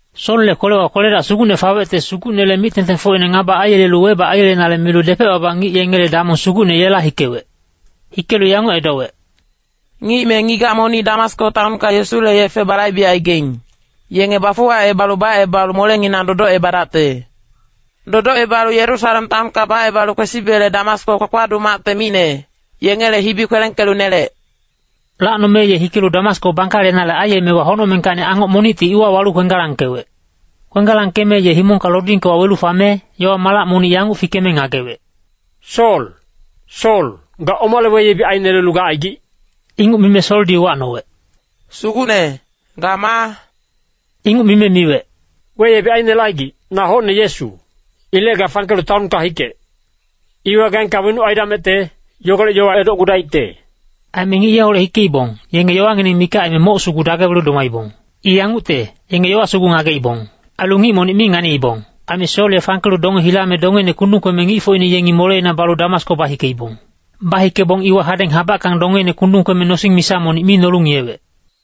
Solle kwelewa kwele-dac sugucne fawecte Sugucnele mic-tengtengfocine ngaba aiyelelu webac aiyelenale milu depec-baba ngic yengele damong sugucne yela hikewec. Hikelu yanguc edowec, “Ngic me ngigac monic Damasko taonka Yesule yefe balaibegaing, yenge bafuwacebalu bacebalu molenginang dodocebadacte. Dodocebalu Yerusalem taonka bacebalu kwesibele Damasko kpakpaduc macte micne, yengele hibi kwelengkelu nelec.” Lacnome ye hikelu Damasko bangkalenale aiyemewa honocmengkacni angoc monicti iwa walu kwenggalangkewec. Kwenggalangkeme ye himongka lodingke wawelu fame, yowa malac monic yanguc fikeme ngagewec, “Sol, Sol, ga omale weyebic ainelelu gacaigic?” Inguc mime Soldi uwacnowec, “Sugucne, ga maa?” Inguc mime miwec, “Weyebic ainelecaigic, na hocne Yesu. Ilec ga fangkelu taonka hikec! Iwa gaengka wenuc aidamecte, yogolec yowa edocgudaicte.” Aime ngic yeholec hikeibong, yenge yowangineng mikac aime moc sugu dagewelu domaibong. I yangucte, yenge yowa sugu ngageibong. Ailu ngic monic mi nganiibong. Aime Sol ye fangkelu donge hilame dongeine kundung kweme ngicfocine yengi moleina balu Damasko bahikeibong. Bahikebong iwa hadeng habackang dongeine kundung kweme nosing misa monic mi nolu ngiyewec.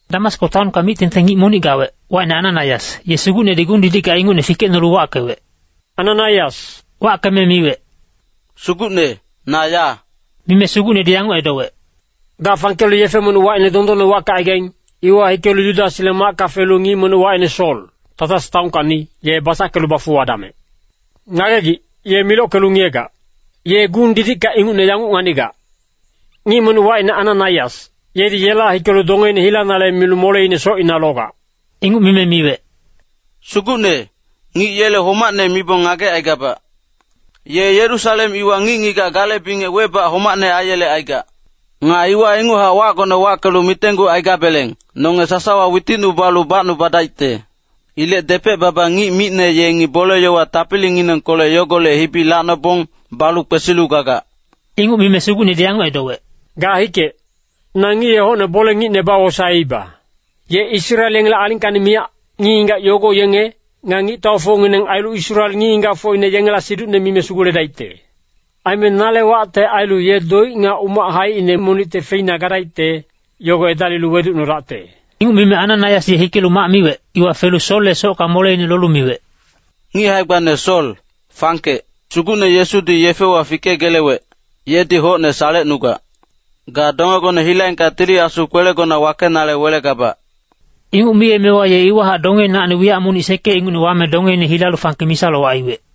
Damasko taonka mic-tengteng ngic monic gawec, wacine Ananaias, ye Sugucnedi gung-didicka ingucne fikecnolu wackewec, “Ananaias.” Wackeme miwec, “Sugucne, na ya.” Mime Sugucnedi yanguc edowec, “Ga fangkelu yefe monic wacine Dondonne wackecaigaing, iwa hikelu Yudasle macka felu ngic monic wacine Sol, Tasas taonkacni, ye basackelu bafuwadamec. Ngagegic, ye milockelu ngiyegac. Ye gung-didicka ingucne yanguc nganigac. Ngic monic wacine Ananaias, yedi yela hikelu dongeine hilanale milu moleine socina logac.” Inguc mime miwec, “Sugucne, ngic yele homacne mibong ngagecaigabac. Ye Yerusalem iwa ngic-ngigac gale bingec webac homacne aiyelecaigac. Nga iwa inguchac wacgone wackelu mitenggucaigabeleng, nonge sasawa witicnubalu bacnubadaicte. Ilec depec-baba ngic micne yengi bole-yowa tapilinginengkolec yogolec hibi lacnobong, balu kwesilu gagac.” Inguc mime Sugucnedi yanguc edowec, “Ga hikec. Na ngic ye hocne bole-ngicne bawosaeiba. Ye Israel yengele alingkacni miyac, ngic-ngigac yogo yenge, nga ngictaufocngineng ailu Israel ngic-ngigacfocine yengela siducne mime suguledaicte. Aime nale wacte ailu ye doic nga umac haicine monicte feina gadaicte, yogo edalilu weducnodacte.” Inguc mime Ananaias ye hikelu mac miwec, iwa felu Solle socka moleine lolu miwec, “Ngic hae-gbane Sol, fangkec. Sugucne Yesudi yefewa fikegelewec, yedi hocne salecnugac. Ga dongegone hilaengka Tili Asu kwelegona wakenale welegabac.” Inguc miyemewa ye iwahac dongeinacni wiyac monic sekec ingucne wame dongeine hilalu fangke misa-lowac aiwec.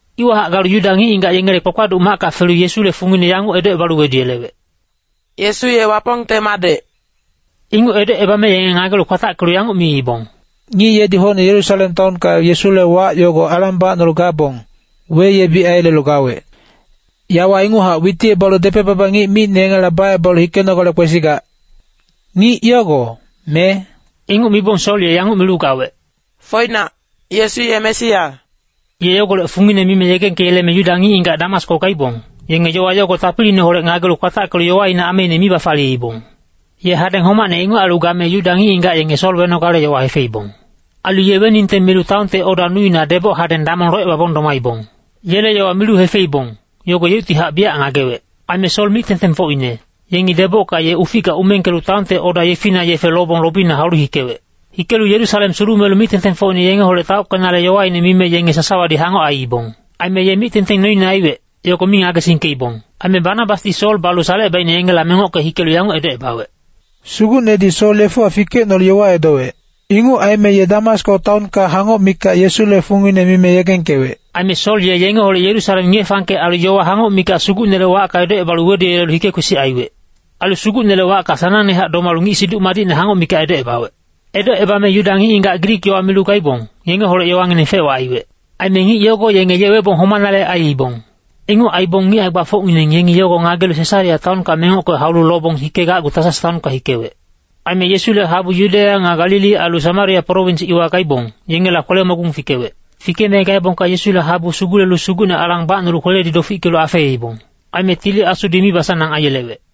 Iwahac galu Yuda ngic-ngigac yengele kpakpaduc macka felu Yesule fungine yanguc edocebalu weduyelewec, “Yesu ye Wapongte madec.” Inguc edocebame yenge ngagelu kwatackelu yanguc miibong, “Ngic yedi hocne Yerusalem taonka Yesule wac yogo alang bacnolu gabong, weyebic aiyelelu gawec. Yawa inguchac witicebalu depec-baba ngic micne yengela bacebalu hikenogale kwesigac. Ngic yogo, me?” Inguc mibong Sol ye yanguc milu gawec, “Foinac, Yesu ye Mesia.” Ye yogolec fungine mime yegengkeyeleme Yuda ngic-ngigac Damasko gaibong, yenge yowa yogo tapiliineholec ngagelu kwatackelu yowaine ameine mi bafaliyeibong. Ye hadeng homacne inguc ailu game Yuda ngic-ngigac yenge Sol wenogale yowa hefeibong. Ailu ye weningte milu taonte oda nuina deboc hadeng damong locebabong domaibong. Yele yowa milu hefeibong, yogo yeuctihac biyac ngagewec. Aime Sol mic-tengtengfocine, yengi debocka ye uficka umengkelu taonte oda yefina yefe lobong lobina haulu hikewec. Hikelu Yerusalem sulumelu mic-tengtengfocine yengeholec taockenale yowaine mime yenge sasawadi hangoc aiibong. Aime ye mic-tengteng noine aiwec, yogo mi ngagesingkeibong. Aime Banabasdi Sol balu salecebaicne yengela mengocke hikelu yanguc edocebawec, “Sugucnedi Sol yefewa fikecnolu yowa edowec. Inguc aime ye Damasko taonka hangoc mikac Yesule fungine mime yegengkewec.” Aime Sol ye yengeholec Yerusalem ngiye-fangkec ailu yowa hangoc mikac Sugucnele wacka edocebalu weduyelelu hike-kwesic aiwec. Ailu Sugucnele wacka sanangnehac domalu ngic Siduc Madicne hangoc mikac edocebawec. Edocebame Yuda ngic-ngigac Grik yowa milu gaibong, yengeholec yowangineng fec-wac aiwec. Aime ngic yogo yenge ye webong homanale aiibong. Inguc aibong ngic hae-gbafocngineng yengi yogo ngagelu Sesarea taonka mengocke haulu lobong hikegacgu Tasas taonka hikewec. Aime Yesule habu Yudeya nga Galili ailu Samaria prowins iwa gaibong, yengela kwele-mogung fikewec. Fikeme gaebongka Yesule habu sugulelu Sugucne alang bacnolu kweledi dofickelu afeibong. Aime Tili Asudi mibasanang aiyelewec.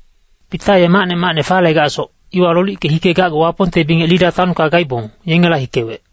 Pita ye macne macne falegacsoc, iwa lolickelu hikegacgu Wapongte bingec Lida taonka gaibong, yengela hikewec.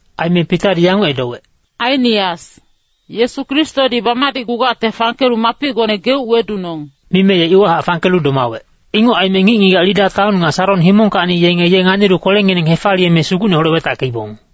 Aime Pitadi yanguc edowec, “Ainias, Yesu Kristodi bamadicgugacte fangkelu mapicgone geuc wedunong.” Mime ye iwahac fangkelu domawec. Inguc aime ngic-ngigac Lida taon nga Saron himongkacni yenge ye nganilu kwelengineng hefaliyeme Sugucneholec wetackeibong.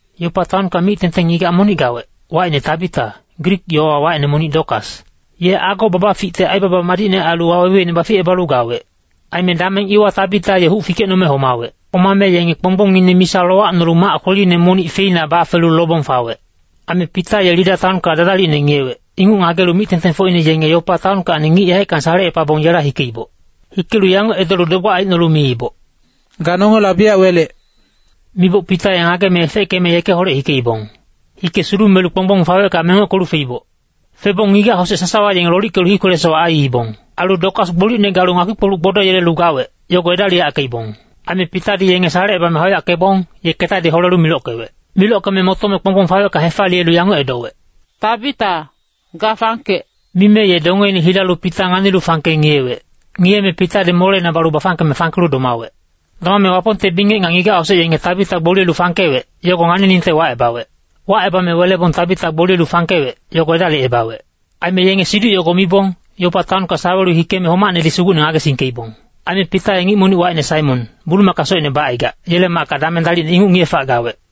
Yopa taonka mic-tengteng ngigac monic gawec, wacine Tabita, Grik yowawa wacine monic Dokas. Ye ago babaficte aibaba madicne ailu waweweine baficebalu gawec. Aime dameng iwa Tabita ye huc fikecnome homawec. Homame yenge kponggbongine misa lowacnolu mac kweline monic feina bafelu lobong fawec. Aime Pita ye Lida taonka dadalicne ngiyewec, inguc ngagelu mic-tengtengfocine yenge Yopa taonkacni ngic yaeckang salecepabong yela hikeiboc. Hikelu yanguc edolu dogbac aicnolu miiboc, “Ga nongela biyac welec!” Miboc Pita ye ngageme efeckeme yekeholec hikeibong. Hike sulumelu kponggbong fawecka mengockelu feiboc. Febong ngigac-hosec sasawa yenge lolickelu hii kwele-sowac aiibong. Ailu Dokas gbolicne galu ngakpi-kpoluc gbodoyelelu gawec, yogo edaliyackeibong. Aime Pitadi yenge salecebame hauyackebong, ye ketadi holelu milockewec. Milockeme motome kponggbong fawecka hefaliyelu yanguc edowec, “Tabita, ga fangkec.” Mime ye dongeine hilalu Pita nganilu fangke ngiyewec. Ngiyeme Pitadi moleina balu bafangkeme fangkelu domawec. Domame Wapongte bingec nga ngigac-hosec yenge Tabita gboliye fangkewec, yogo nganiningte wacebawec. Wacebame welebong Tabita gboliyelu fangkewec, yogo edalicebawec. Aime yenge siduc yogo mibong, Yopa taonka sawelu hikeme homacnedi Sugucne ngagesingkeibong. Aime Pita ye ngic monic wacine Saimon, bulumaka socine bacaigac, yele macka dameng dalicne inguc ngiye-fac gawec.